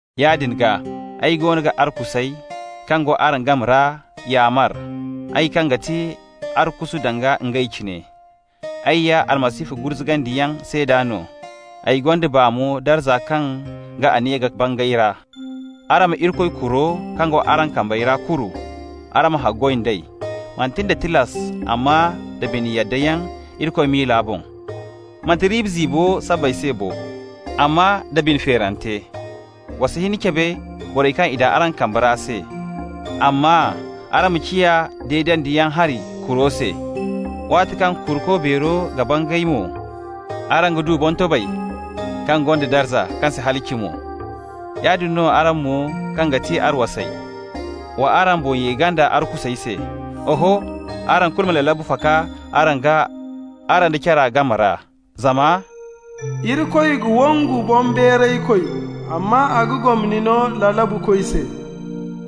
Yaadin gaa, ay goono ga arkusey kaŋ go araŋ game ra yaamar, ay kaŋ ga ti arkusu danga ngey cine. Ay ya Almasihu gurzugandiyaŋ seeda no, ay gonda baa mo darza kaŋ ga aniya ka bangay ra. Araŋ ma Irikoy kuro kaŋ go araŋ kambe ra kuru. Araŋ ma haggoy d'ey, manti nda tilas, amma da bine yaddayaŋ Irikoy miila boŋ. Manti riiba ziibo sabbay se bo, amma da bine feerante. Wa si hin cabe borey kaŋ i daŋ araŋ kambe ra se, amma araŋ ma ciya deedandiyaŋ hari kuro se. Waati kaŋ Kuruko Beero ga bangay mo, araŋ ga du boŋtobay kaŋ gonda darza, kaŋ si halaci mo. Yaadin no araŋ mo kaŋ ga ti arwasey, wa araŋ boŋ ye ganda arkusey se. Oho, araŋ kulu ma lalabu faka araŋ gaa araŋ da cara game ra, zama «Irikoy ga wongu boŋbeeraykoy amma a ga gomni no lalabukoy se.»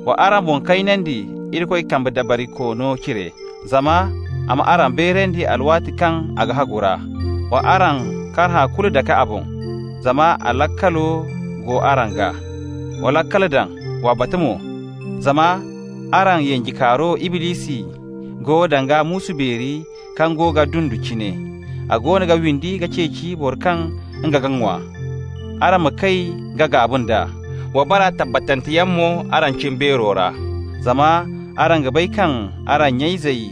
Wa araŋ boŋ kaynandi Irikoy kambe dabarikoono cire, zama a m'araŋ beerandi alwaati kaŋ ga hagu ra. Wa araŋ karhã kulu dake a boŋ, zama a laakalo go araŋ gaa. Wa laakal daŋ! Wa batu mo! Zama araŋ yanjekaaro Iblisi go danga muusu beeri kaŋ go ga dundu cine. A goono ga windi ka ceeci boro kaŋ nga ga ŋwa. Araŋ ma kay ka gaaba nd'a, wa bara tabbatanteyaŋ mo araŋ cimbeero ra. Zama araŋ ga bay kaŋ araŋ nya-izey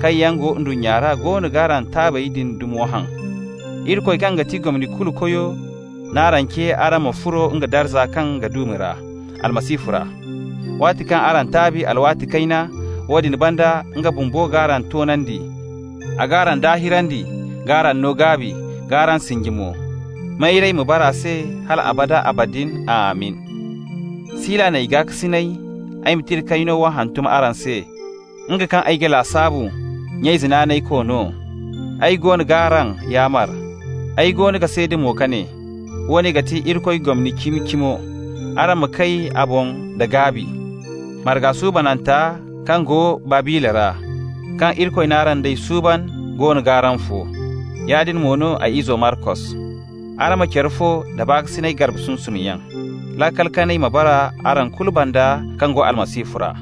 kaŋ yaŋ go ndunnya ra goono g'araŋ taabey din dumo haŋ. Irikoy kaŋ ga ti gomni kulu Koyo n'araŋ ce araŋ ma furo nga darza kaŋ ga duumi ra Almasihu ra. Waati kaŋ araŋ taabi alwaati kayna, woodin banda nga bumbo g'araŋ toonandi, a g'araŋ daahirandi, k'araŋ no gaabi, k'araŋ sinji mo. Mayray ma bara a se hal abada abadin. Amin! Sila n'ay gaakasinay ay ma tira kayno wo hantum araŋ se, nga kaŋ ay ga lasaabu nya-ize naanaykoy no. Ay goono g'araŋ yaamar, ay goono ga seeda mo ka ne: woone ga ti Irikoy gomni cimi-cimo. Araŋ ma kay a boŋ da gaabi. Marga suubananta kaŋ go Babila ra, kaŋ Irikoy n'araŋ d'ey suuban, goono g'araŋ fo. Yaadin mo no ay izo Markos. Araŋ ma care fo da baakasinay garbe sunsumyaŋ. Laakal kanay ma bara araŋ kulu banda kaŋ go Almasihu ra.